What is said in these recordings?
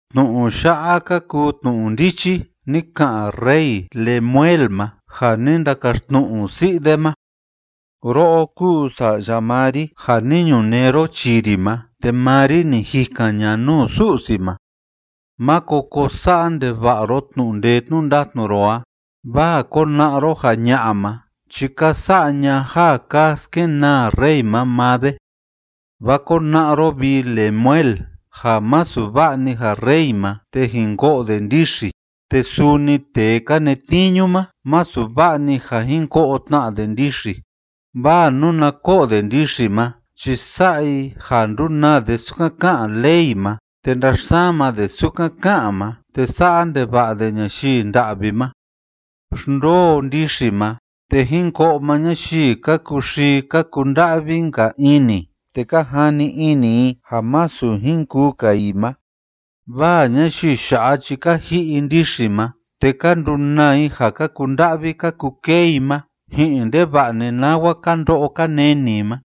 Tnu'u ya'a ka kuu tnu'u ndichi ni ka'an rey Lemuel ma ja ni ndakaxtnu'u si'i de ma. Ro'o kúu sa'ya maa ri ja ni ñunee ro chii ri ma, te maa ri ni jikan ña'a nuu Su'si ma. Máko ko sa'a ndeva'a ro tnu'u ndee tnu'u ndatnu ro a, vaa kona'a ro ja ña'a ma chi ka sa'a ña ja ka skenaa rey ma maa de. Vaa kona'a ro, vi Lemuel, ja masu va'a‑ni ja rey ma te jin ko'o de ndixi, te suni tee ka netniñu ma, masu va'a‑ni ja jin ko'o tna de ndixi. Vaa nuna ko'o de ndixi ma chi sa'a i ja ndunaa de sukan ká'an ley ma te ndaxsama de sukan ká'an ma te sa'a ndeva'a de ñayii nda'vi ma. Xndoo ndixi ma, te jin ko'o maa ñayii ka kuxii ka kunda'vi‑nka ini te ka jani ini i ja masu jin kuu‑ka i ma. vaa ñayii ya'a chi ka ji'i i ndixi ma, te ka ndunaa i ja ka kunda'vi ka kukee i ma ji'in ndeva'a‑ni nawa ka ndo'o ka neni i ma.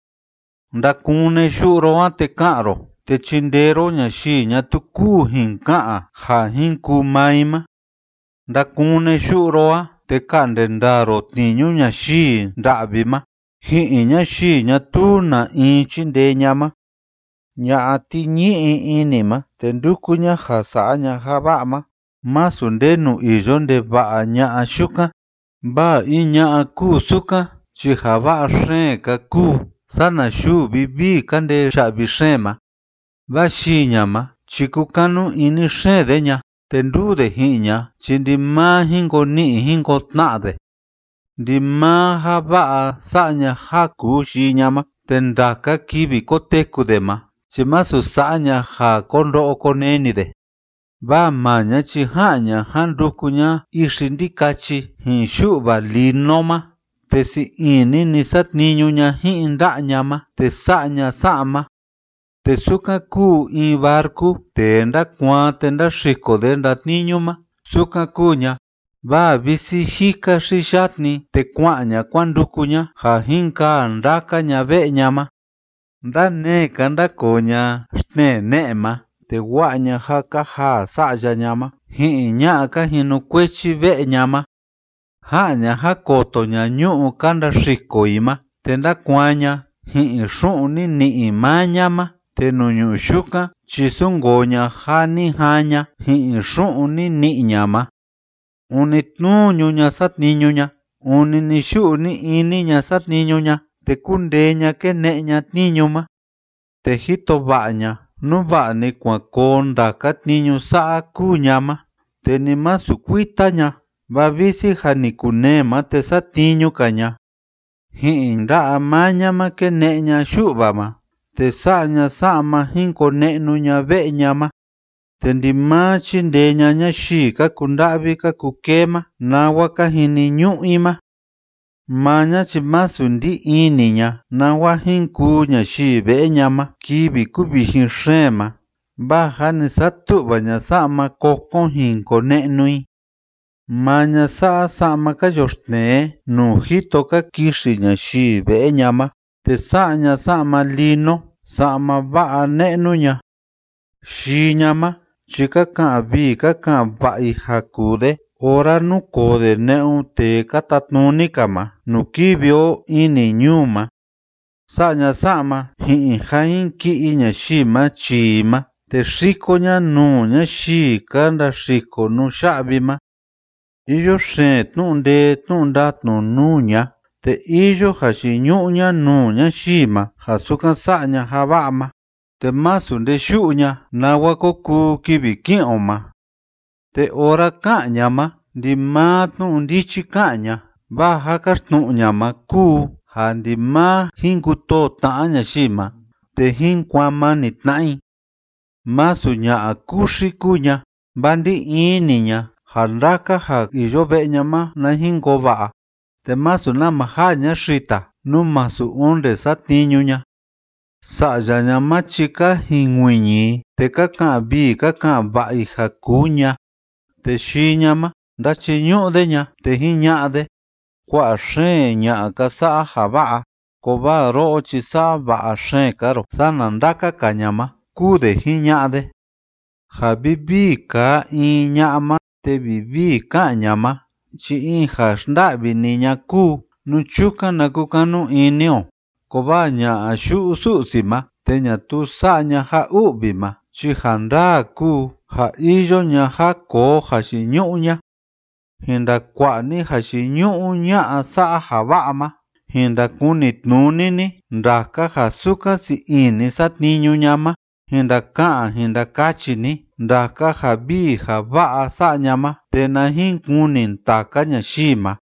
Ndakune yu'u ro a, te ka'an ro te chindee ro ñayii ñatuu kúu jin ka'an ja jin kuu maa i ma. Ndakune yu'u ro a, te ka'nde ndaa ro tniñu ñayii nda'vi ma ji'in ñayii ñatuu na in chíndee ña'a ma. Ña'a tiñi'i ini ma te ndúku ña ja sa'a ña ja va'a ma, masu ndenu iyo ndeva'a ña'a yukan. Vaa in ña'a kúu sukan chi ja va'a xeen‑ka kúu sana yuu vivii ma ka ndee ya'vi xeen ma. Vaa yii ña ma chi kúkanu ini xeen de ña, te nduu de ji'in ña chi ndimaa jin ko ni'i jin ko tna'a de. Ndimaa ja va'a sa'a ña ja kuu yii ña ma, te ndaka kivi koteku de ma chi masu sa'a ña ja ko ndo'o ko neni de. Vaa maa ña chi ja'an ña jan nduku ña ixi ndikachi ji'in yu'va lino ma, te sii ini‑ni satniñu ña ji'in nda'a ña ma te sa'a ña sa'ma. Te sukan kúu in barcu tee ndakuaan te ndaxiko de ndatniñu ma, sukan kúu ña, vaa visi jika xi yatni, te kua'an ña kuan nduku ña ja jin kaa ndaka ña ve'e ña ma. Ndanee‑ka ndákoo ña xtnee ne'e ma, te wa'a ña ja ka jaa sa'ya ña ma ji'in ña'a ka jinukuechi ve'e ña ma. Ja'an ña jan koto ña ñu'ú ka ndaxiko i ma te ndákuaan ña ji'in xu'un ni ni'i maa ña ma, te nuu ñu'ú yukan chi súnkoo ña ja ni jaan ña ji'in xu'un ni ni'i ña ma. Ûni tnuñu ña satniñu ña, ûni ni‑yu'u ni‑ini ña satniñu ña, te kúndee ña kéne'e ña tniñu ma, te jito va'a ña nú va'a‑ni kuan koo ndaka tniñu sa'a kúu ña ma te ni masu kuita ña, vaa visi jâ ni kunee ma te satniñu‑ka ña. Ji'in nda'a maa ña ma kéne'e ña yu'va ma, te sa'a ña sa'ma jin kone'nu ña ve'e ña ma. Te ndimaa chíndee ña ñayii ka kunda'vi ka kukee ma nawa ka jiniñu'u i ma. Maa ña chi másu ndí ini ña nawa jin kuu ñayii ve'e ña ma kivi kuvijin xeen ma, vaa jâ ni satu'va ña sa'ma kokon jin kone'nu i. Maa ña sa'a sa'ma ka yoxtnee nuu jito ka kixi ñayii ve'e ña ma, te sa'a ña sa'ma lino, sa'ma va'a ne'nu ña. Yii ña ma chi ka ka'an vii ka ka'an va'a i ja kuu de ora núkoo de ne'un tee ka tatnuni‑ka ma nuu kivi o ini ñuu ma. Sa'a ña sa'ma ji'in ja jin ki'i ñayii ma chii i ma, te xiko ña nuu ñayii ka ndaxiko nuya'vi ma. Iyo xeen tnu'u ndee tnu'u ndatnu nuu ña, te iyo jayiñu'u ña nuu ñayii ma ja sukan sa'a ña ja va'a ma, te másu nde yu'u ña nawa ko kuu kivi ki'in o ma. Te ora ká'an ña ma, ndimaa tnu'u ndichi ká'an ña, vaa ja káxtnu'u ña ma kúu ja ndimaa jín kutoo tna'a ñayii ma te jín kuaan mani tna'a i. Másu ña'a kuxi kúu ña, vaa ndí ini ña ja ndaka ja iyo ve'e ña ma na jin koo va'a, te másu nama jaa ña xita nú masu onde satniñu ña. Sa'ya ña ma chi ka jinkuiñi i, te ka ka'an vii ka ka'an va'a i ja kuu ña, te yii ña ma ndáchiñu'u de ña, te jiña'a de: “Kua'a xeen ña'a ka sa'a ja va'a, kovaa ro'o chi sa'a va'a xeen‑ka ro sana ndaka‑ka ña ma”, kúu de jiña'a de. Ja vivii kaa in ña'a ma te vivii ká'an ña ma chi in ja xnda'vi‑ni ña'a kúu, nú chukan na kukanu ini o, kovaa ña'a yu'u Su'si ma te ñatuu sa'a ña ja u'vi ma chi ja ndaa kúu ja iyo ña ja koo jayiñu'u ña. Jin ndakua'a ni jayiñu'u ña'a sa'a ja va'a ma, jin ndakunitnuni ni ndaka ja sukan sii ini satniñu ña ma. Jin ndaka'an jin ndakachi ni ndaka ja vii ja va'a sa'a ña ma te na jin kuni ndaka ñayii ma.